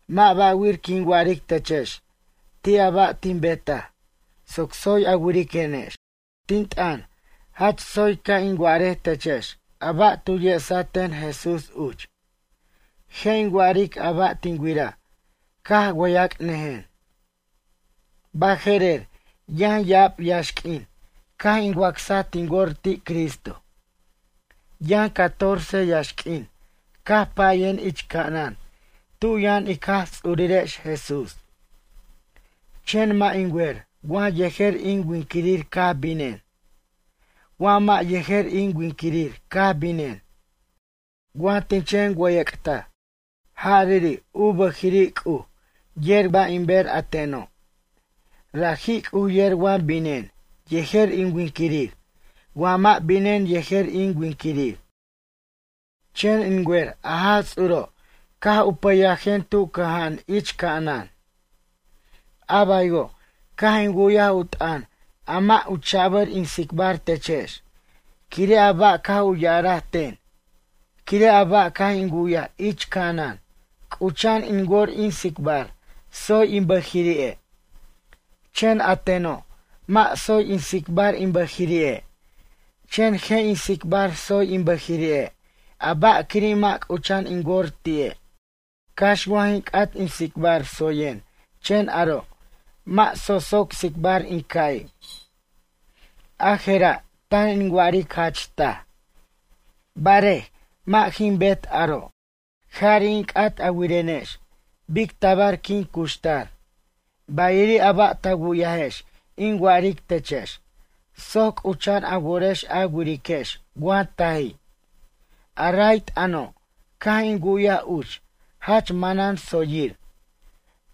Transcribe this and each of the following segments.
Mʌ' ba'wir quin wa'aric techex ti' a ba' tin betaj soc tsoy a wiriquenex. Tin t'ʌn, jach tsoy ca' in wa'arej techex a ba' tu yesaten Jesús uch. Je' in wa'aric a ba' tin wiraj caj wʌyac'nʌjen. Baje'rer yʌn ya'ab yaxq'uin caj in wacsaj tin wor ti' Cristo. Yʌn catorce yaxq'uin caj payen ich ca'anan tu yʌn ic Jaj Ts'urirex Jesús. Chen mʌ' in wer wa yejer in winquirir caj binen, wa mʌ' yejer in winquirir caj binen, wa tin chen wʌyʌc'taj. Jariri' u bʌjiri' C'uj yer ba' in ber a teno'. Raji' C'uj yer wa binen yejer in winquirir wa mʌ' binen yejer in winquirir. Chen in wer a Jaj Ts'uro' caj u pʌyajen tu cʌja'an ich ca'anan. A baywo' caj in wu'yaj u t'ʌn a mʌ' u cha'bʌr in tsicbar techex quire' a ba' caj u ya'araj ten. Quire' a ba' caj in wu'yaj ich ca'anan c'ucha'an in wor in tsicbar tsoy in bʌjiri'e', chen a teno' mʌ' tsoy in tsicbar in bʌjiri'e' chen je' in tsicbar tsoy in bʌjiri'e' a ba' quiri' mʌ' c'ucha'an in wor ti'e'. Cax wa jin c'at in tsicbar tsoyen chen aro' mʌ' socsoc tsicbar in ca'i', a jera' tan in wa'aric jach taj, barej, mʌ' jin bet aro'. Jari' in c'at a wirenex bic tabar quin cuxtar, bayiri' a ba' ta wu'yajex in wa'aric techex soc c'ucha'an a worex a wiriquex wa taji'. A ray t'ʌno' caj in wu'yaj uch jach manan tsoyir.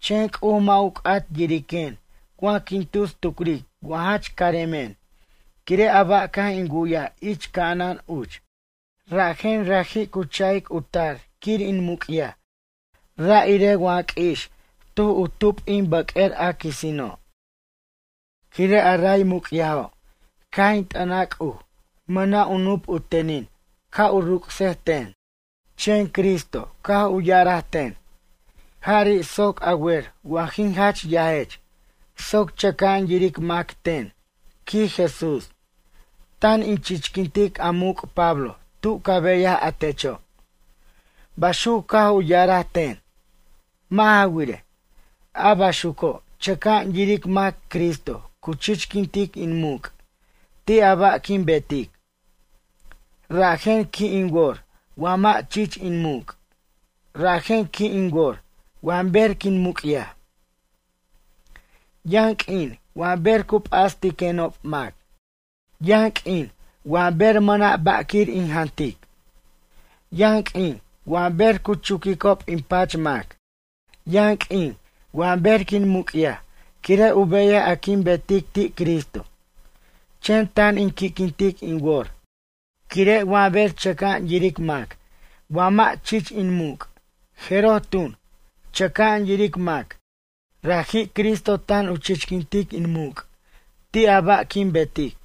Chen C'uj mʌ' u c'at yiriquen wa quin tus tucric wa jach caremen quire' a ba' caj in wu'yaj ich ca'anan uch. Rajen raji' cu cha'ic u tar quir in muc'yaj ra' irej wa q'ui'ix tuj u tup in bʌq'uer a quisino'. Quire' a ray muc'yajo' caj in t'ʌnaj C'uj mʌna' u nup u tenin ca' u ruc'sej ten. Chen Cristo caj u ya'araj ten: “Jari' soc a wer wa jin jach yajech soc chʌca'an yiric mac ten, quij Jesús, tan in chichquintic a muc' Pablo tu ca beyaj a techo'.” Baxuc caj u ya'araj ten. Mʌ' ja wirej, a baxuco' chʌca'an yiric mac Cristo cu chichquintic in muc' ti' a ba' quin betic. Rajen qui' in wor wa mʌ' chich in muc'. Rajen qui' in wor wa ber quin muc'yaj. Yʌn q'uin wa ber cu p'astiquenob mac. Yʌn q'uin wa ber mʌna' ba' quir in jantic. Yʌn q'uin wa ber cu chuquicob in pach mac. Yʌn q'uin wa ber quin muc'yaj quire' u beyaj a quin betic ti' Cristo. Chen tan in qui'quintic in wor quire' wa ber chʌca'an yiric mac wa mʌ' chich in muc' jeroj tun, chʌca'an yiric mac raji' Cristo tan u chichquintic in muc' ti' a ba' quin betic.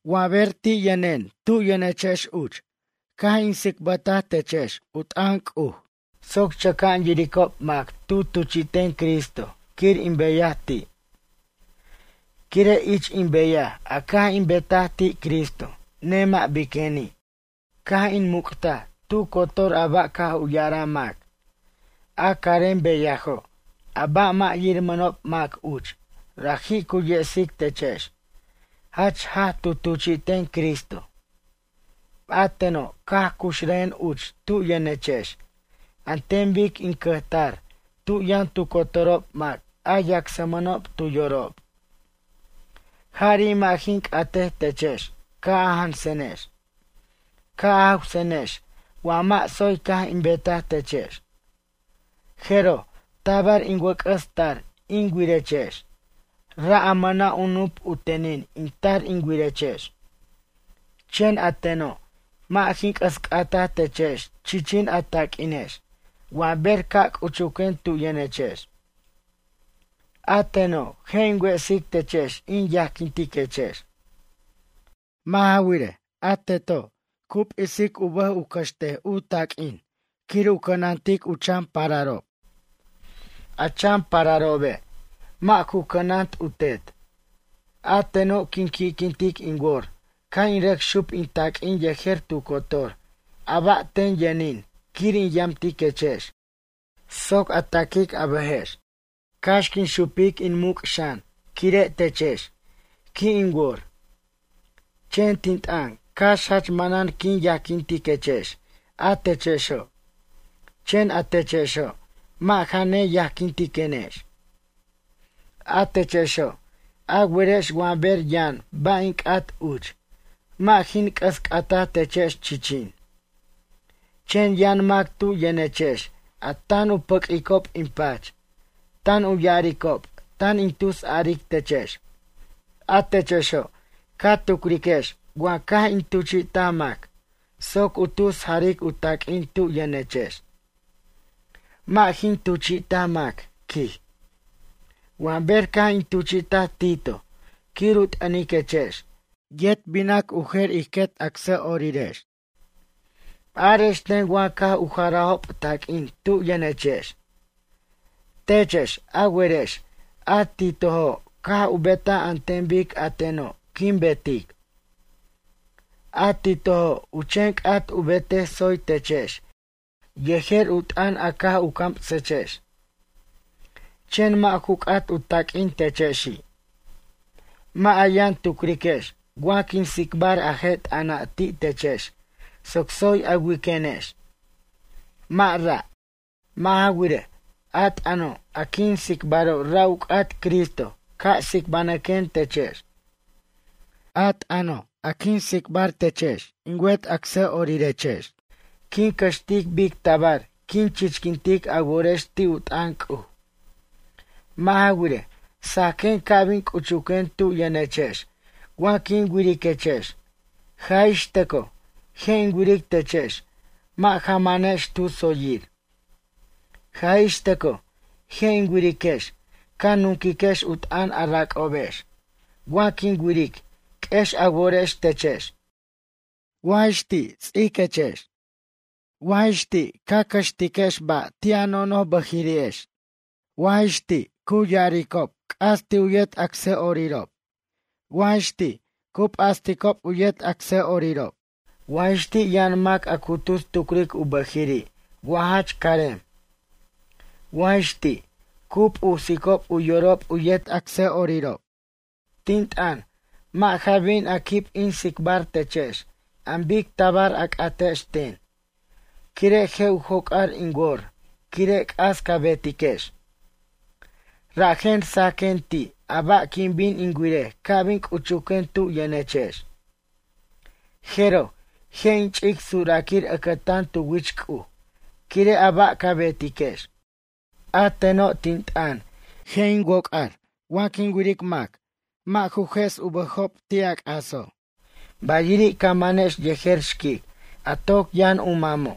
Wa ber ti' yʌnen tu yʌnechex uch caj in tsicbʌtaj techex u t'ʌn C'uj soc chʌca'an yiricob mac tu tuchi'ten Cristo quir in beyaj ti'. Quire' ich in beyaj a caj in betaj ti' Cristo nemʌ' biqueni', caj in muc'taj tu cotor a ba' caj u ya'araj mac. A carem beyajo' a ba' mʌ' yirmʌnob mac uch raji' cu yesic techex jach jaj tu tuchi'ten Cristo. A teno' caj cuxrʌjen uch tu yʌnechex an ten bic in cʌjtar tu yʌn tu cotorob mac a yacsmʌnob tu yorob. Jari' mʌ' jin c'atej techex ca' a jansenex. Ca' a jawsenex wa mʌ' tsoy caj in betaj techex. Jeroj tabar in wʌc'ʌs tar in wirechex, ra' a mʌna' u nup u tenin in tar in wirechex. Chen a teno' mʌ' jin c'ʌs c'ata techex chichin a taq'uinex wa ber ca' c'uchuquen tu yʌnechex. A teno' je' in wesic techex in yajquintiquechex. Mʌ' ja wirej, a teto' cu p'isic u bʌj u cʌxt u taq'uin quir u cʌnatic u chan pararob. A chan pararobe', mʌ' ju cʌnant u tet. A teno' quin qui'quintic in wor ca' in rʌc xup in taq'uin yejer tu cotor a ba' ten yʌnin quir in yamtiquechex soc a taquic a bʌjex. Cax quin xupic in muc' xan quire' techex, qui' in wor. Chen tin t'ʌn cax jach manan quin yajquintiquechex a techexo'. Chen a techexo', mʌ' ja neyajquintenex. A techexo', a werex wa ber yʌn ba' in c'at uch, mʌ' jin c'ʌs c'ataj techex chichin. Chen yʌn mac tu yʌnechex a tan u pʌq'uicob in pach, tan u ya'aricob tan in tusaric techex. A techexo' ca tucriquex wa caj in tuchi'taj mac soc u tus jaric u taq'uin tu yʌnechex? Mʌ' jin tuchi'taj mac, quij. Wa ber caj in tuchi'taj Tito quir u t'ʌniquechex, yet binac u jer ij quet acsa'orirex. Arex ten wa caj u jarajob taq'uin tu yʌnechex. Techex, a werex a Titojo' caj u betaj an ten bic a teno' quin betic. A Titojo' u chen c'at u betej tsoy techex yejer u t'ʌn a caj u camsechex. Chen mʌ' ju c'at u taq'uin techexi'. Mʌ' a yʌn tucriquex wa quin tsicbar a je' t'ʌna' ti' techex soc tsoy a wiquenex, mʌ' ra'. Mʌ' ja wirej, a t'ʌno' a quin tsicbaro' ra' u c'at Cristo ca' tsicbanʌquen techex. A t'ʌno' a quin tsicbar techex in wet acsa'orirex quin cʌxtic bic tabar quin chichquintic a worex ti' u t'ʌn C'uj. Mʌ' ja wirej, sajquen ca' bin c'uchuquen tu yʌnechex wa quin wiriquechex, jaj ix tʌcoj, je' in wiric techex mʌ' ja manex tu tsoyir. Jaj ix tʌcoj, je' in wiriquex ca nunquiquex u t'ʌn a rac'obex, wa quin wiric q'uex a worex techex. Wa jix ti', ts'iquex, wa jix ti' ca cʌxtiquex ba' ti' a nonoj bʌjiri'ex, wa jix ti', cu ya'aricob c'as ti' u yet acsa'orirob, wa jix ti' cu p'asticob u yet acsa'orirob, wa jix ti' yʌn mac a cu tus tucric u bʌjiri' wa jach carem. Wa jix ti', cu p'usicob u yorob u yet acsa'orirob. Tin t'ʌn, mʌ' ja bin a quib in tsicbar techex an bic tabar a c'atex ten, quire' je' u joc'ar in wor quire' c'as ca betiquex. Rajen sajquen ti' a ba' quin bin in wirej ca' bin c'uchuquen tu yʌnechex. Jeroj, je' in ch'ic suraquir ʌcʌtan tu wich C'uj quire' a ba' ca betiquex. A teno' tin t'ʌn, je' in woc'ar wa quin wiric mac mʌ' ju jʌs u bʌjob ti' a c'aso', bayiri' ca manex yejer xquic a toc yʌn u mamo'.